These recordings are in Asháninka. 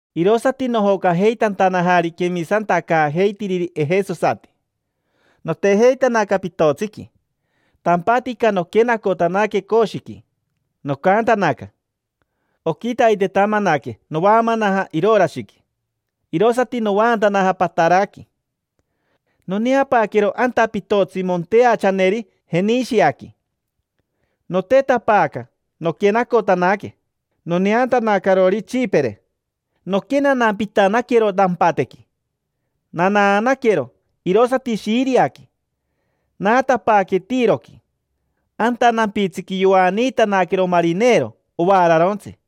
Irosati nojocajeitantanajari quemisantacaajeitiriri ejesosati. Notejeitanaca pitotsiqui, tampatica noquenacotanaque Coshiqui, nocantanaca shiririri. Oquitaitetamanaque novaamanaja Irorashiqui, irosati novaantanaja Pataraqui. Noneapaaquero anta pitotsi monteachaneri Jenishiaqui. Notetapaaca, noquenacotanaque. Noneantanacarori Tsipire, noquenanampitanaquero nampatequi. Nanaanaquero, irosati Shiriaqui, naatapaaque Tiroqui. Anta nampitsiqui yoaniitanaquero marinero ovaararontsi.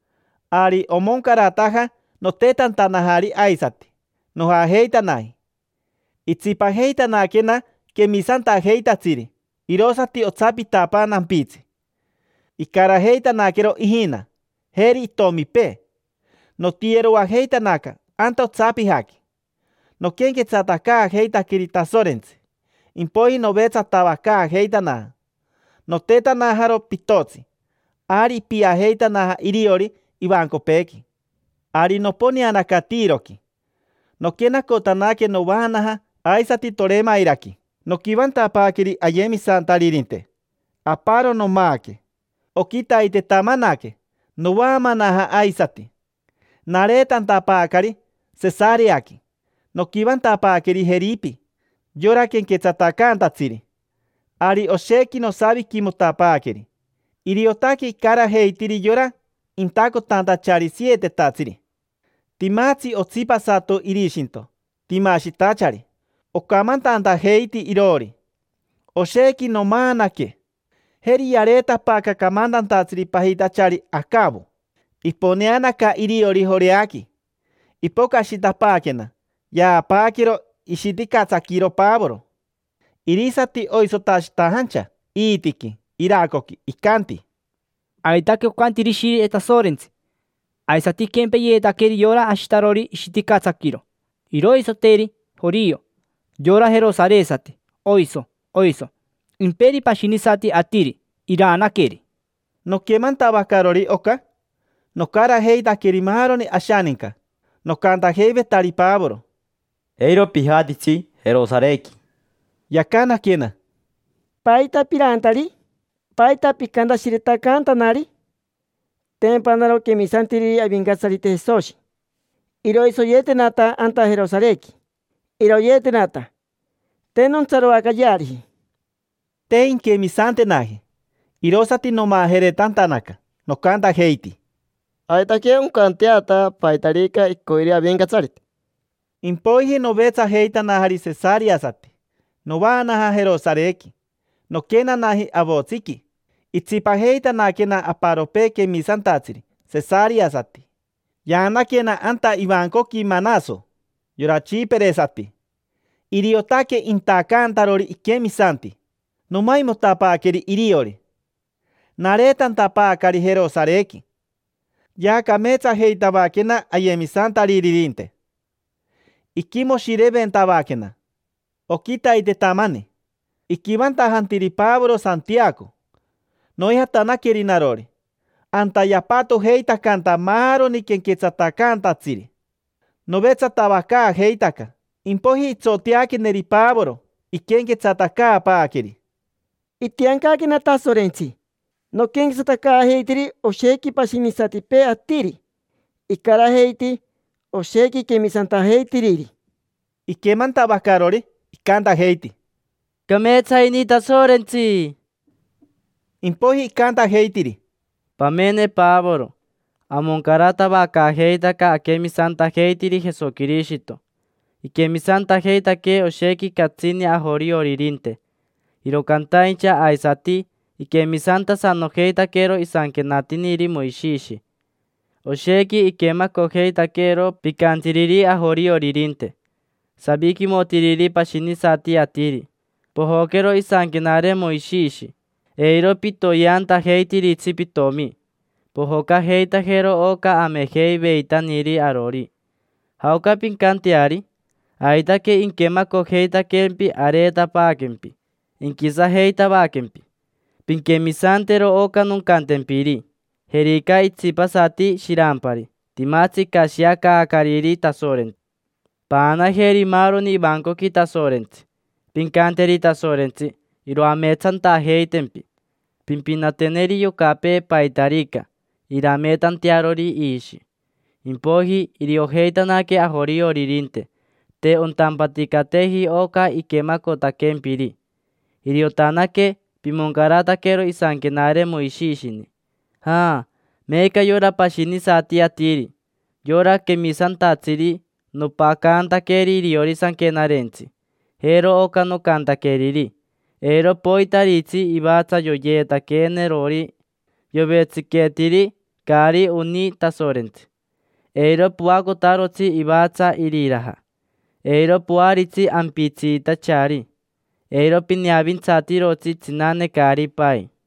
Ari omoncarataja notetantanajari aisati, nojajeitanaji. Itsipajeitanaquena quemisantajeitatsiri irosati otsapitapaa nampitsi, icarajeitanaquero ijina, jeri itomipee. Notiyeroajeitanaca anta otsapijaqui, noquenquetsatacaajeitaqueri Tasorentsi. Impoiji novetsatavacaajeitanaja. Notetanajaro pitotsi, ari ipiajeitanaja iriori ivancopeequi. Ari noponeanaca Tiroqui, noquenacotanaque, novaanaja aisati Toremairaqui. Noquivantapaaqueri ayemisantaririnte. Aparo nomaaque. Oquitaitetamanaque, novaamanaja aisati. Nareetantapaacari Sesareaqui, noquivantapaaqueri Jeripi, yora quenquetsatacaantatsiri. Ari oshequi nosaviquimotapaaqueri. Iriotaque icarajeitiri yora intacotantachari sietetatsiri. Timatsi otsipasato irishinto, timashitachari; ocamantantajeiti iroori. Oshequi nomaanaque. Jeri yareetapaaca camantantatsiri pajitachari Acavo, iponeanaca iriori Joreaqui. Ipocashitapaaquena, yaapaaquero ishiticatsaquiro Pavoro. Irisati oisotashitajancha iitiqui, iracoqui. Icanti: —Aitaque ocanti Ishire Tasorentsi: “Aisati inquempeyeetaqueri yora ashitarori ishiticatsaquiro. Iroisoteri jorio, yora jerosaresati: oiso, oiso. Imperi pashinisati atiri, iraanaqueri”. Noquemantavacarori oca, nocarajeitaqueri maaroni ashaninca, nocantajeivetari Pavoro: —Eiro pijatitsi Jerosarequi. Yacanaquena: —¿Paita piraantari? ¿Paita picantashiretacaantanari? Tempa naro quemisantiriri Avincatsarite Jesoshi. Iroisoyeetenata anta Jerosarequi, iroyeetenata: te nontsaroacayeariji. Te inquemisantenaji, irosati nomajeretantanaca. Nocantajeiti: —Aitaque oncanteata paitarica icoiri Avincatsarite. Impoiji novetsajeitanajari sesareasati, novaanaja Jerosarequi: noquenanaji avotsiqui. Itsipajeitanaquena aparopee quemisantatsiri, sesareasati. Yaanaquena anta ivancoqui Manaso, yora tsipiresati: iriotaque intacantarori iquemisanti. Nomaimotapaaqueri iriori. Nareetantapaacari Jerosarequi, yaacameetsajeitavaquena ayemisantaririnte, iquimoshireventavaquena. Oquitaitetamani iquivantajantiri Pavoro Santiaco, noijatanaqueri narori. Anta yapatojeitacanta maaroni quenquetsatacaantatsiri. Novetsatavacaajeitaca, impoiji itsoteaqueneri Pavoro, iquenquetsatacaapaaqueri: —Itiancaquena Tasorentsi noquenquetsatacaajeitiri oshequi pashinisatipee atiri. Icarajeiti oshequi quemisantajeitiriri. Iquemantavacarori, icantajeiti: —Cameetsa ini Tasorentsi. Impoiji icantajeitiri: —Pamene, Pavoro, amoncaratavacaajeitaca aquemisantajeitiri Jesoquirishito. Iquemisantajeitaque oshequi catsini ajorioririnte, iro cantaincha aisati iquemisantasanojeitaquero isanquenatiniri Moishishi. Oshequi iquemacojeitaquero picantiriri ajorioririnte, saviquimotiriri pashinisati atiri: “Pojoquero isanquenare Moishishi. Eiro pitoyeantajeitiritsi pitomi. Pojocajeitajero oca amejeiveitaniri arori”. ¿Jaoca pincanteari? Aitaque inquemacojeitaquempi, areetapaaquempi: inquisajeitavaquempi. Pinquemisantero oca noncantempiri: jerica itsipasati shirampari, timatsi icashiacaacariri Tasorentsi. Paanajeri maaroni ivancoqui Tasorentsi, pincanteri Tasorentsi iroameetsantajeitempi. Pimpinateneri yocapee paitarica, irameetantearori iishi. Impoiji iriojeitanaque ajorioririnte te ontampaticateji oca iquemacotaquempiri. Iriotanaque pimoncarataquero isanquenare Moishishini. Ja meeca yora pashinisati atiri, yora quemisantatsiri: nopacantaqueri iriori sanquenarentsi. Jero oca nocantaqueriri: “Eiro poitaritsi ivatsa yoyeetaquenerori yovetsiqueetiri, caari oni Tasorentsi. Eiro poacotarotsi ivatsa iriraja. Eiro poaritsi ampitsiitachari. Eiro pineavintsatirotsi tsinane caari pai”.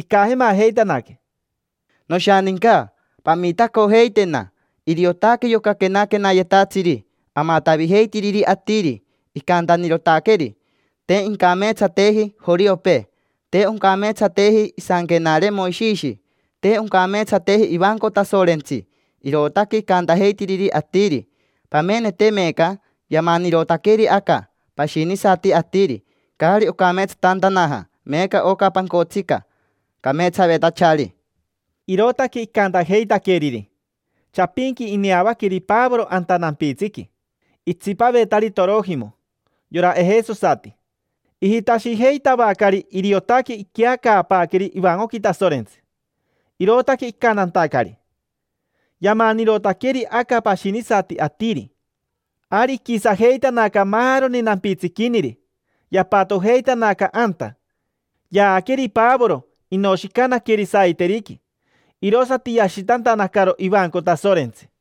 Icajemajeitanaque: —Noshaninca, pamitacojeitena. Iriotaque yoca quenaquenayetatsiri amatavijeitiriri atiri; icantanirotaqueri: “Te incameetsateji joriopee. Te oncameetsateji isanquenare Moishishi. Te oncameetsateji ivanco Tasorentsi”. Irootaque icantajeitiriri atiri. Pamenete meeca yamanirotaqueri aca pashinisati atiri, caari ocameetsatantanaja meeca oca pancotsica cameetsavetachari. Irootaque icantajeitaqueriri. Chapinqui ineavaqueri Pavoro anta nampitsiqui, itsipavetari Torojimo: yora ejesosati. Ijitashijeitavacari iriotaque iqueacaapaaqueri ivancoqui Tasorentsi, irootaque icantantacari: “Yamanirotaqueri aca pashinisati atiri”. Ari iquisajeitanaca maaroni nampitsiquiniri, yapatojeitanaca anta. Yaaqueri Pavoro shepi, inoshicanaqueri saiteriqui, sorororo. Irosati yashitantanacaro ivanco Tasorentsi.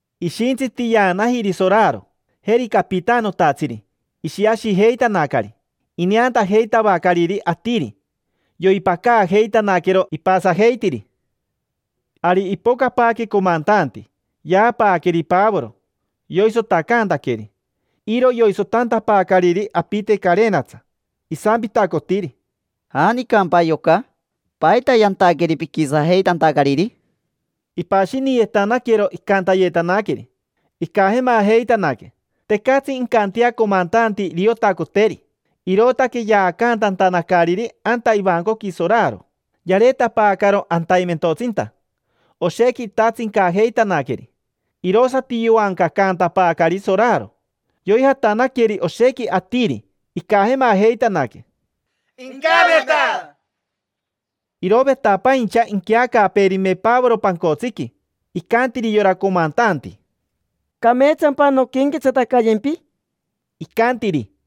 Ishintsiti yaanajiri soraro, jeri capitanotatsiri, ishiashijeitanacari. Ineantajeitavacariri atiri, yoipacaajeitanaquero ipasajeitiri. Ari ipocapaaque comantanti, yaapaaqueri Pavoro. Yoisotacantaqueri. Iro yoisotantapaacariri apite carenatsa. Isampitacotiri: —¿Janicampa yoca? ¿Paita yantaqueri piquisajeitantacariri? Ipashiniyetanaquero icantayetanaqueri. Icajemajeitanaque, tecatsi incantea comantanti iriotacoteri, irootaque yaacantantanacariri anta ivancoqui soraro. Yareetapaacaro ataimentotsinta, oshequi itatsincajeitanaqueri. Irosati yoancacaantapaacari soraro. Yoijatanaqueri oshequi atiri, icajemajeitanaque: —Paanirotanaqueri. Irovetapaincha inqueacaapeerime Pavoro pancotsiqui. Icantiri yora comantanti: —¿Cameetsampa nonquenquetsatacayempi? Icantiri: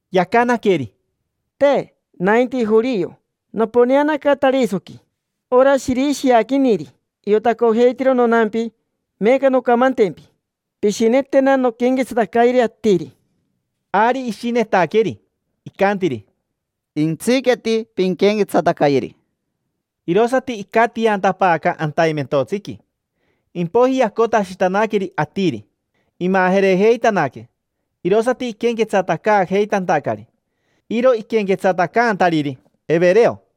Yacanaqueri: —Te. Nainti jorio. Noponeanaca Tarisoqui, ora shirishiaquiniri. Iotacojeitiro nonampi. Meeca noncamantempi: pishinetena nonquenquetsatacayeri atiri. Ari ishinetaqueri, icantiri: —Jentsiqueti, pinquenquetsatacayeri. Irosati icatiantapaaca ataimentotsiqui, cati. Impoiji yacotashitanaqueri atiri. Imajerejeitanaque, irosati iquenquetsatacaajeitantacari. Iro iquenquetsatacaantariri evereo.